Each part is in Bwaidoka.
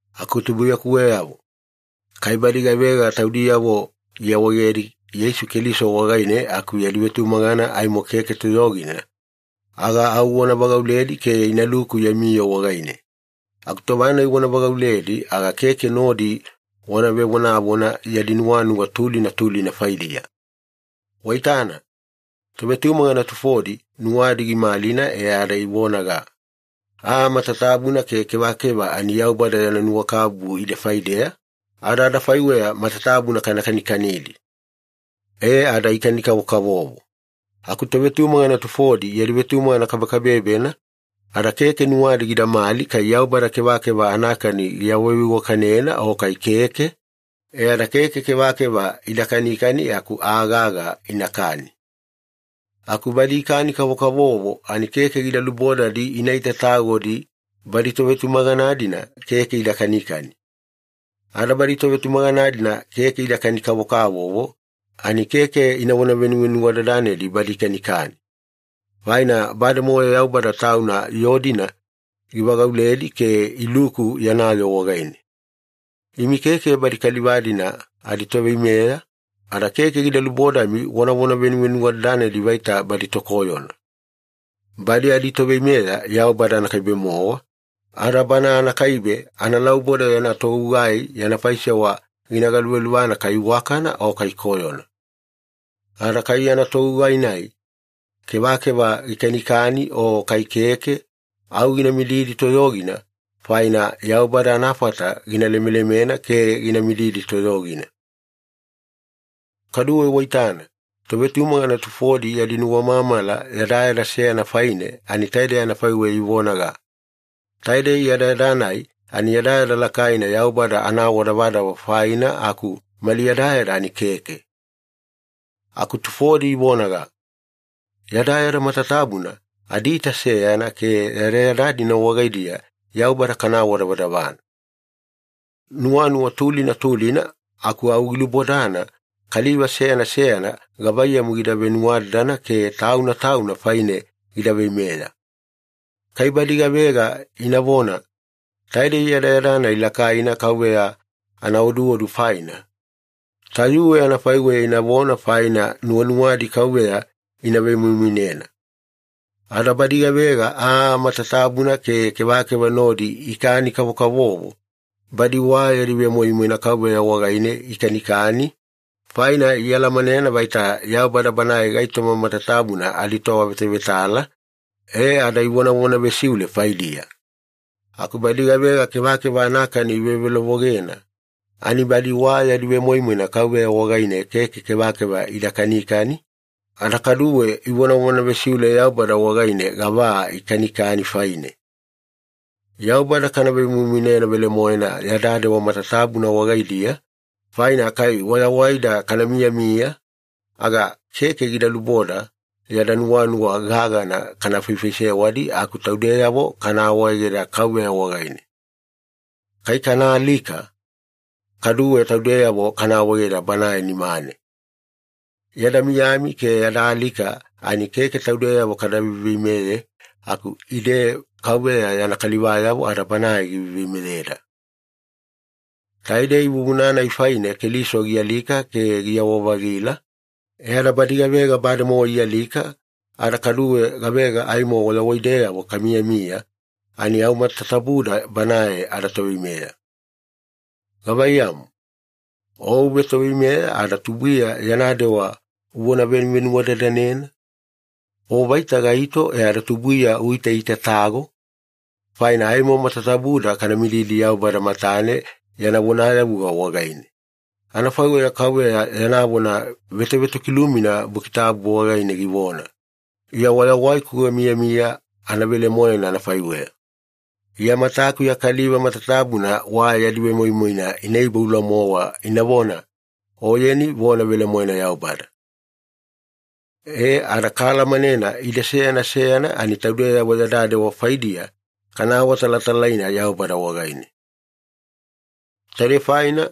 Aku tubuiyakuweyavo, kai badi gavega taudiyavo iawaegedi Yeisu Keliso wagaine aku yadi vetumagana aimo keke toyogina, aga au wana vagauledi ke inaluku yami yoo wagaine. Aku tova-nai wana vagauledi aga keke nodi wana vevonavona yadi nuwanuwa tulina tulina faidiya. Waitana, tovetumagana tufodi nuwadi gimalina e ada ivonaga, “Aa matatabuna ke kevakeva ani Yaubada yana nuwakabubu ide faideya, ada adafaiweya matatabuna kana kanikanidi.” E ada ikani-kavokavovo. Aku tovetumagana tufodi yadi vetumagana kabekabebena, ada keke nuwadi gidamali kai Yaubada kevakeva anakani giawaveiwakanena o kai keke, e ada keke kevakeva ida kanikani aku aa gaga inakani. Aku badi ikani-kavokavovo ani keke gida lubodadi ina itatagodi badi tovetumagana-dina keke ida kanikani. Ada badi tovetumagana-dina keke ida kani-kavokavovo ani keke inavona venuvenuwadadanedi badi ikanikani. Faina bademowa Yaubada Tauna yoo-dina givagauledi ke iluku yana yoo wagaine. Imi keke badi kaliva-dina aditoveimeya, ada keke gida lubodami wanavona venuvenuwadadanedi vaita badi tokoyona. Badi aditoveimeya Yaubada anakaibe-mowa, ada Bana anakaibe analauboda yana togugai yana faisewa gina galuvaluvana kai iwakana o kai koyona. Ada kai yana togugai-nai kevakeva gikanikani o kai keke, au gina mididi toyogina, faina Yaubada anafata gina lemelemena ke gina mididi toyogina. Kaduwe waitana, tovetumagana tufodi yadi nuwamamala yadayada seyana faine ani taidei anafaiweya ivonaga, “Taidei yadayada-nai ani yadayada lakaina Yaubada anaawadavadava faina aku mali yadayada ani keke.” Aku tufodi ivonaga, “Yadayada matatabuna adiita seyana ke yadayada-dina wagaidiya Yaubada kana awadavadavana.” Nuwanuwa tulina tulina aku au gilubodana kaliva seyana seyana gavaiyamu gida venuwadadana ke tauna tauna faine gida veimeya. Kai badi gavega inavona, “Taidei yadayada-nai lakaina Kauveya anaoduodu faina,” tayuwe anafaiweya inavona faina nuwanuwadi Kauveya ina vemoimoinena. Ada badi gavega aa matatabuna ke kevakeva nodi ikani-kavokavovo, badi wa yadi vemoimoina Kauveya wagaine ikanikani, faina ialamanena vaita Yaubada Banae gaitoma matatabuna aditoavetavetala, e ada ivonavona vesiule faidiya. Aku badi gavega kevakeva anakani ivevelovogena, ani badi wa yadi vemoimoina Kauveya wagaine keke kevakeva ida kanikani, ada kaduwe ivonavona vesiule Yaubada wagaine gava aa ikanikani faine. Yaubada kana vemoimoinena velemoena yada dewa matatabuna wagaidiya, faina kai wayawaida kana miyamiya, aga keke gida luboda yada nuwanuwa gagana kana faifaisewadi aku taudeyavo kana awaegeda Kauveya wagaine. Kai kana alika, kaduwe taudeyavo kana awaegeda Banae nimane. Yada miyami ke yada alika ani keke taudeyavo kada veiveimeye, aku ide Kauveya yana kalivayavo ada Banae giveiveimeyeda. Taidei vuvuna-nai faine Keliso gialika ke giyawa-vagila, e ada badi gavega bademowa ialika ada kaduwe gavega aimo wayawaideyavo kamiyamiya ani au matatabuda Banae adaToveimeya. Gavaiyamu, o uvetoveimeya ada tubuiya yana dewa uvona venuvenuwadadanena? O vaita gaito e ada tubuiya uitaitatago? Faina aimo matatabuda kana mididi Yaubada matane yana vonayavuga wagaine. Anafaiweya KAUVEYA yana vona vetovetokilumina Buki Tabu wagaine givona, “Iya wayawaiku gamiyamiya anavelemoena anafaiweya, Iya matakuya kaliva matatabuna wa yadi vemoimoina ina iboula-mowa inavona, ‘Oyeni vona velemoena Yaubada.’” E, ada kaalamanena ide seyana seyana ani taudeyavo yada dewa faidiya kana awatalatalaina Yaubada wagaine. Taidei faina,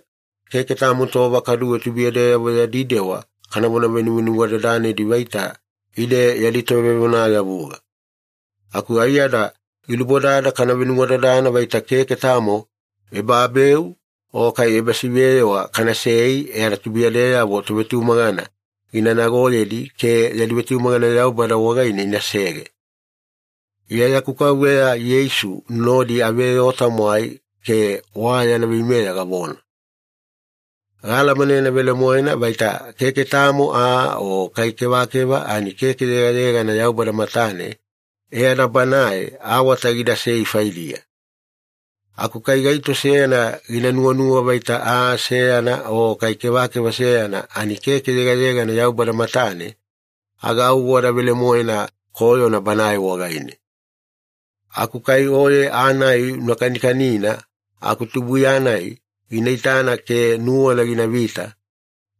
keke tamo tova kaduwe tubuiyadeyavo yadi dewa kanavona venuvenuwadadanedi vaita ide yadi tovevonayavuga. Aku aiyada gilubodada kana venuwadadana vaita keke tamo ebabeu o kai ebasiveyewa kanasei e ada tubuiyadeyavo tovetumagana gina nagoyedi ke yadi vetumagana Yaubada wagaine inasege. Iya yaku Kauveya Yeisu nodi aveyoo-tamwai ke wa yana veimeya gavona. Gaalamanena velemoena vaita keke tamo aa o kai kevakeva ani keke yegayegana Yaubada matane e ada Banae awata gidasei faidiya. Aku kai gaito seyana gina nuwanuwa vaita aa seyana o kai kevakeva seyana ani keke yegayegana Yaubada matane, aga au wada velemoena koyona banae wagaine. Aku kai oye aa-nai una kanikanina aku tubuiya-nai gina itani ke nuwana ginavita,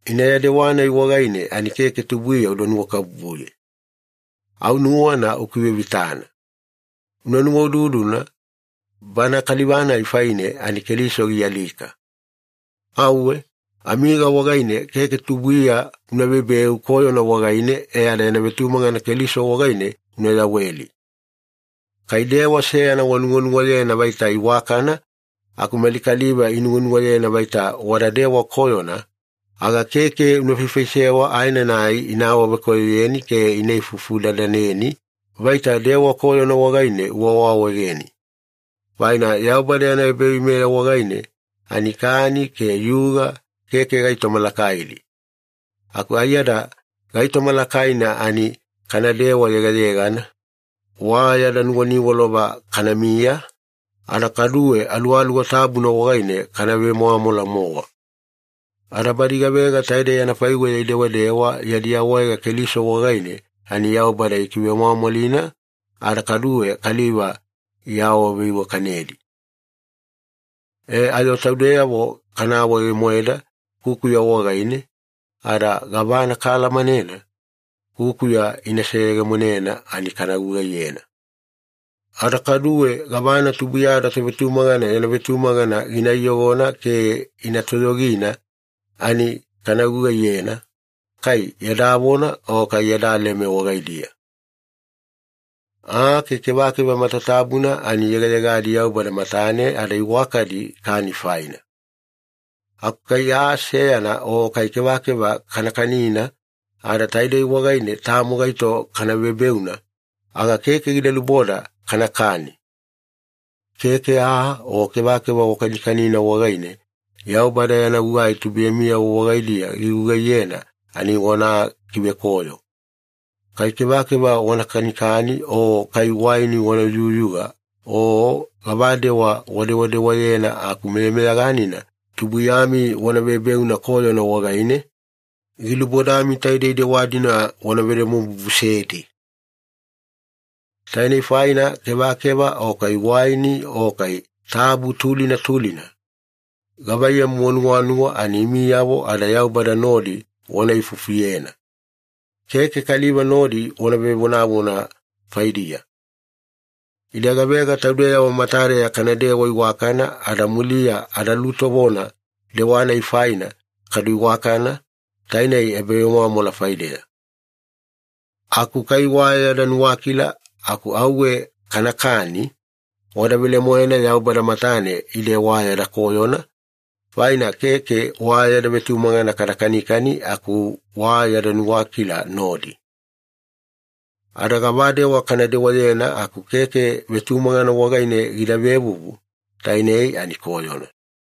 ina ya dewa-nai wagaine ani keke tubuiya uda nuwakabubuye. Au nuwana ukivevitana. Una nuwaududuna, bana kaliva-nai faine ani Keliso gialika. Auwe, amiga wagaine keke tubuiya una vebeu koyona wagaine e ada yana vetumagana Keliso wagaine una yaweli. Kai dewa seyana wanuwanuwayena vaita iwakana aku mali kaliva inuwanuwayena vaita wada dewa koyona, aga keke una faifaisewa aenanai ina awavekoyoyeni ke ina ifufu-dadaneni vaita dewa koyona wagaine uawaawaegeni. Faina Yaubada yana ebaveimeya wagaine ani kani ke yuga keke gaitoma lakaidi, aku aiyada gaitoma lakaina ani kanadewa yegayegana, wa yada nuwaniwalova kanamiya, ada kaduwe Aluwaluwa Tabuna wagaine kana vemwamwala-mowa. Ada badi gavega taidei anafaiweya idewadewa yadi awaega Keliso wagaine, ani Yaubada ikivemwamwalina ada kaduwe kaliva iawaveiwakanedi. E ayo taudeyavo kana awaege-moeda kukuya wagaine, ada gavana kaalamanena kukuya gina seyegemonena ani kana gugaiyena. Ada kaduwe gavana tubuiyada tovetumagana yana vetumagana gina iyogona ke ina toyogina ani kana gugaiyena, kai yada vona o kai yada leme wagaidiya. Aa ke kevakeva matatabuna ani yegayegadi Yaubada matane ada iwakadi kani faina. Aku kai aa seyana o kai kevakeva kana kanina ada taidei wagaine tamo gaito kana vebeuna, aga keke gida luboda kanakani. Keke aa o kevakeva wakanikanina wagaine Yaubada yana gugai tubuiyamiyavo wagaidiya gigugaiyena ani wana kivekoyo. Kai kevakeva wana kanikani o kai waini wana yuyuga o gavadewa wadewadewayena aku meyameyaganina tubuiyami wana vebeuna koyona wagaine, gilubodami taidei dewa-dina wana vedomobubusedi. Tainei faina kevakeva o kai waini o kai tabu tulina tulina, gavaiyamu wanuwanuwa ani imiyavo ada Yaubada nodi wana ifufuyena. Keke kaliva nodi wana vevonavona faidiya. Ide gavega taudeyavo matadeya kanadewa iwakana ada muliya adalutovona dewa-nai faina kadu iwakana, tainei ebavemwamwala faideya. Aku kai wa yada nuwakila aku auwe kanakani, wada velemoena Yaubada matane ide wa yada koyona, faina keke wa yada vetumagana kada kanikani aku wa yada nuwakila nodi. Ada gavadewa kana dewayena aku keke vetumagana wagaine gida vevuvu, tainei ani koyona.